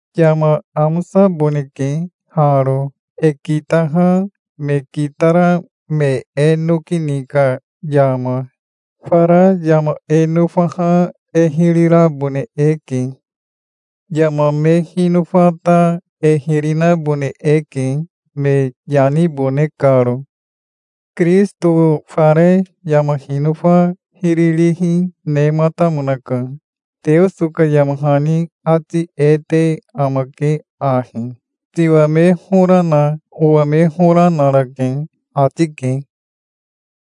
Yama amosaboneke haro, e kitaha me kitara me e noki ni ka yama. Fara yama e nofaha e hiri rabone eke. Yama me hinofa ta e hiri nabone eke, me yanibone karo. Kirisito fare yama hinofa hiri rihi nematamonaka. Teoso ka yama hani ati e te amake ahi: "Tiwa me hora na owa me hora, narake", ati ke.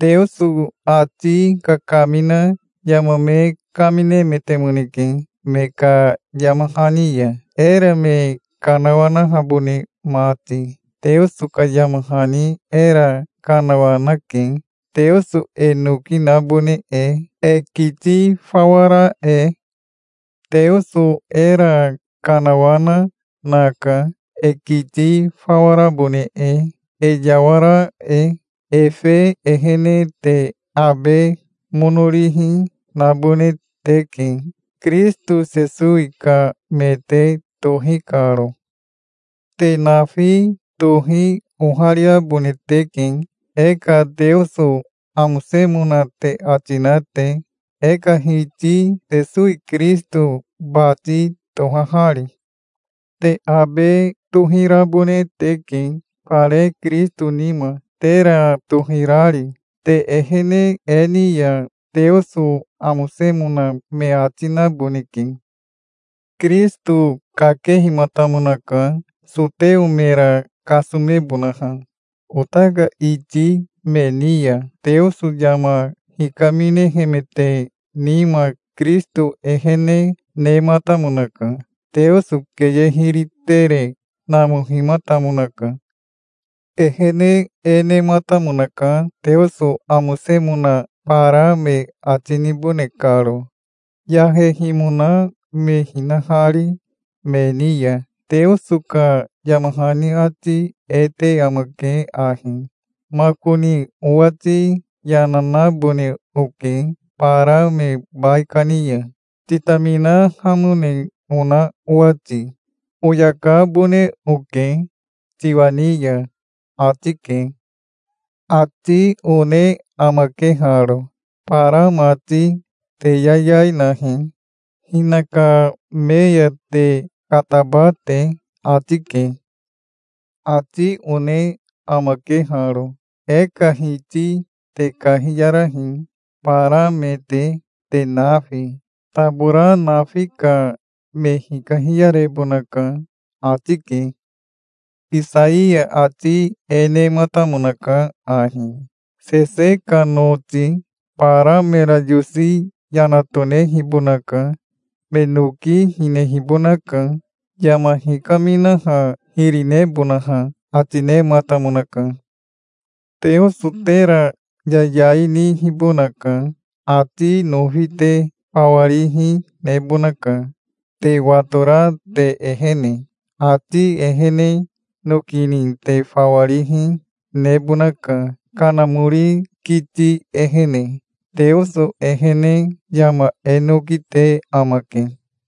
Teoso ati kakamina yama me kaminemetemoneke me ka yama hani ya, era me kanawanahabone mati. Teoso ka yama hani era kanawanake, Teoso e noki nabone e, e kiti fawa ra e. Teoso era kanawana naka, e kiti fawa rabone e, e yawara e. Efe ehene te abe mono rihi, nabone teke, Kirisito Sesowi ka me te tohi karo. Te nafi tohi ohariabone teke, e ka Teoso amosemona te ati na te, e ka Hiti Sesowi Kirisito bati tohahari. Te abe tohirabone teke, fare Kirisito nima, tera tohirari. Te ehene e ni ya Teoso amosemona me ati naboneke. Kirisito kakehimatamonaka soteo mera kasomebonaha. Ota ka iti me ni ya Teoso yama hikaminehemete nima Kirisito ehene nematamonaka. Teoso keye hiri tere namohimatamonaka. Ehene e nematamonaka, Teoso amosemona bara me ati nibone karo, yahehimona me hinahari me ni ya. Teoso ka yama hani ati e te amake ahi: "Makoni owati yana nabone oke bara me baikani ya, titaminahamone ona owati. Oyakabone oke tiwa ni ya", ati ke. Ati one amake haro: "Bara mati, te yayai nahi, hinaka me ya te kataba te", ati ke. Ati one amake haro: "E ka Hiti te kahiyarahi, bara me te, te nafi. Tabora nafi ka me hikahiyarebonaka", ati ke. Isaiya ati e nematamonaka ahi: "Sese ka noti bara mera yosi yana tonehibonaka. Me noki hinehibonaka, yama hikaminaha hiri nebonaha", ati nematamonaka. Teoso tera yayai nihibonaka. Ati nofi te fawa rihi nebonaka, te watora te ehene. Ati ehene noki ni te fawa rihi nebonaka, Kanamori kiti ehene. Teoso ehene yama e noki te amake.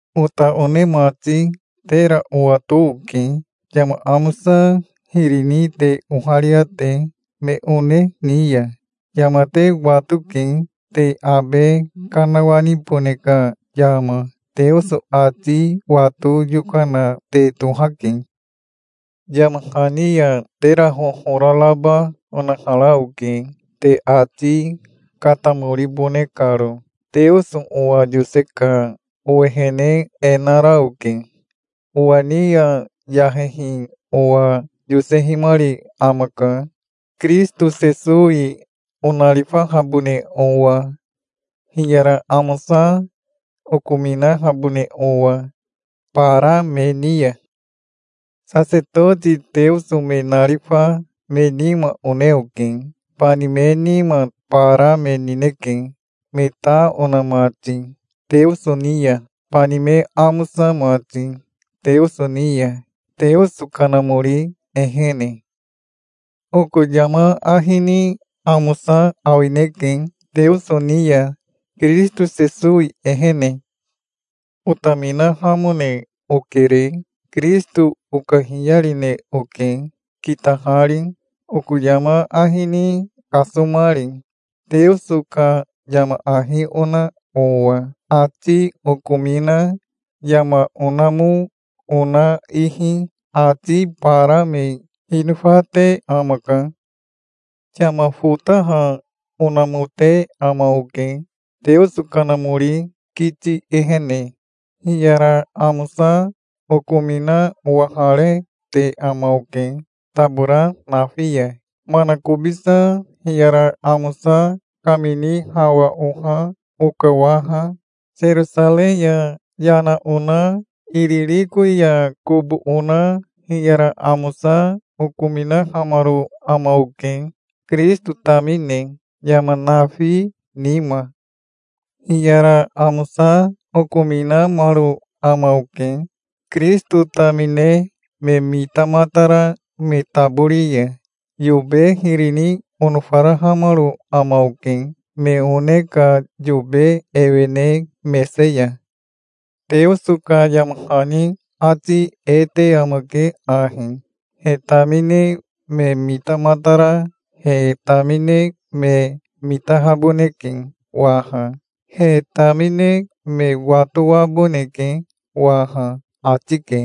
Ota one mati, tera owato oke, yama amosa hiri ni te oharia te, me one ni ya. Yama te watoke, te abe kanawanibone ka yama. Teoso ati wato yokana te tohake. Yama hani ya tera hohora raba onahara oke, te ati katamoribone karo. Teoso owa yose ka owehene e nara oke. Owa ni ya yahehi owa yosehimari amaka, Kirisito Sesowi onarifahabone owa, hiyara amosa okominahabone owa bara me ni ya. Sasetoti Teoso me narifa me nima one oke. Bani me nima bara me nineke, me ta ona mati Teoso ni ya, bani me amosa mati Teoso ni ya, Teoso Kanamori ehene. Oko yama ahi ni amosa awineke Teoso ni ya, Kirisito Sesowi ehene. Otaminahamone okere. Kirisito okahiyarine oke kitahari, oko yama ahi ni kasomari, Teoso ka yama ahi ona owa. Ati okomina yama onamo ona ihi ati bara me hinofate amaka. Yama fotaha onamote ama oke, Teoso Kanamori kiti ehene. Hiyara amosa okomina owaharete ama oke tabora nafi ya. Manakobisa hiyara amosa kamini hawa oha oka waha. Serosarei ya yana ona Iririko ya kobo ona hiyara amosa okominahamaro ama oke, Kirisito tamine, yama nafi nima. Hiyara amosa okominamaro ama oke, Kirisito tamine me mitamatara me tabori ya. Yobe hiri ni onofarahamaro ama oke, me one ka yobe ewene mese ya. Teoso ka yama hani ati e te amake ahi: "He tamine me mitamatara he tamine me mitahaboneke waha. He tamine me watoaboneke waha", ati ke.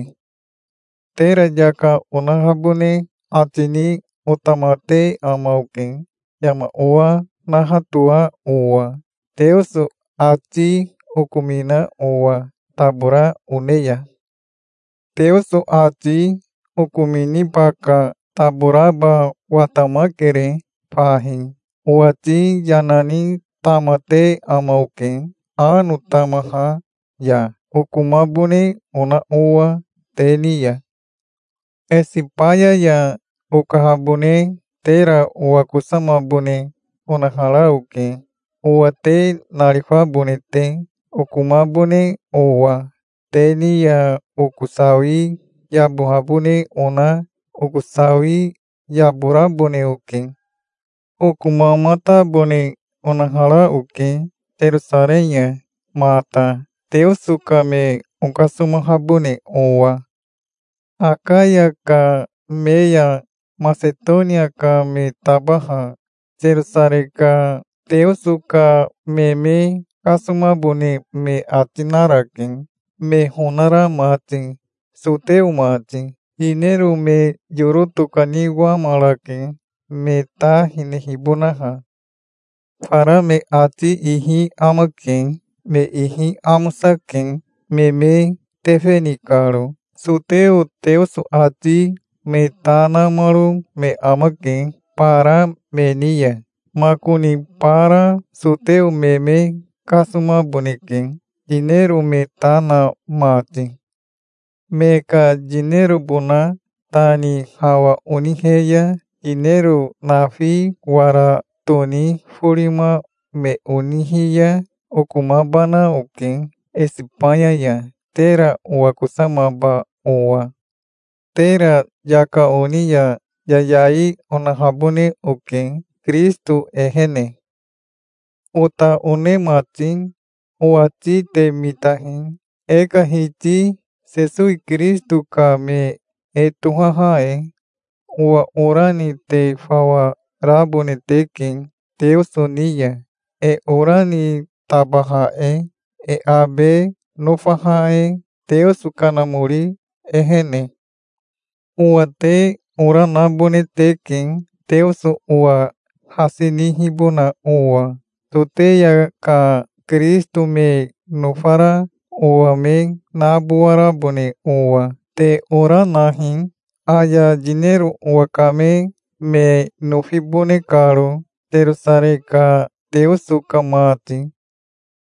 Tera yaka onahabone ati ni otamate ama oke, yama owa nahatoa owa, Teoso ati okomina owa tabora one ya. Teoso ati okominiba ka taboraba watamakere fahi. Owati yana ni tamate ama oke ano tamaha ya, okomabone ona owa te ni ya. Esibaya ya okahabone tera owakosamabone onahara oke, owa te narifabone te, okomabone owa. Te ni ya oko sawi yabohabone ona oko sawi yaborabone oke. Okomamatabone onahara oke Serosarei ya mata, Teoso ka me okasomahabone owa. Akaya ka me ya Masetonia ka me tabaha Serosarei ka Teoso ka me me kasomabone me ati narake, me honara mati, soteo mati. Yinero me yoro tokaniwamarake, me ta hinehibonaha. Fara me ati ihi amake. Me ihi amosake, me me tefe ni karo. Soteo Teoso ati me ta namaro me amake bara me ni ya. Makoni bara soteo me me kasomaboneke, yinero me ta na mati. Me ka yinerobona ta ni hawa onihe ya yinero nafi wara toni forima me onihi ya okomabana oke Esibaya ya, tera owakosamaba owa. Tera yaka oni ya yayai onahabone oke Kirisito ehene. Ota one mati owati te mitahi, e ka Hiti Sesowi Kirisito ka me e tohaha e. Owa ora ni te fawa rabone teke Teoso ni ya, e ora ni tabaha e, e abe nofaha e, Teoso Kanamori ehene. Owa te ora nabone teke, Teoso owa hasi nihibona owa, Soteya ka Kirisito me nofara owa me nabowarabone owa. Te ora, nahi, aya yinero owakame me nofibone karo, Serosarei ka Teoso ka mati.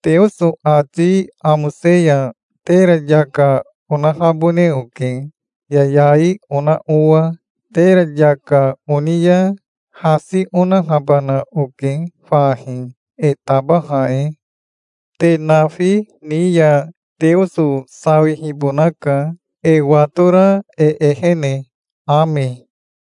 Teoso ati amose ya tera yaka onahabone oke, yayai ona owa. Tera yaka oni ya hasi onahabana oke fahi, e tabaha e. Te nafi ni ya Teoso sawihibonaka, e watora e ehene. Ame.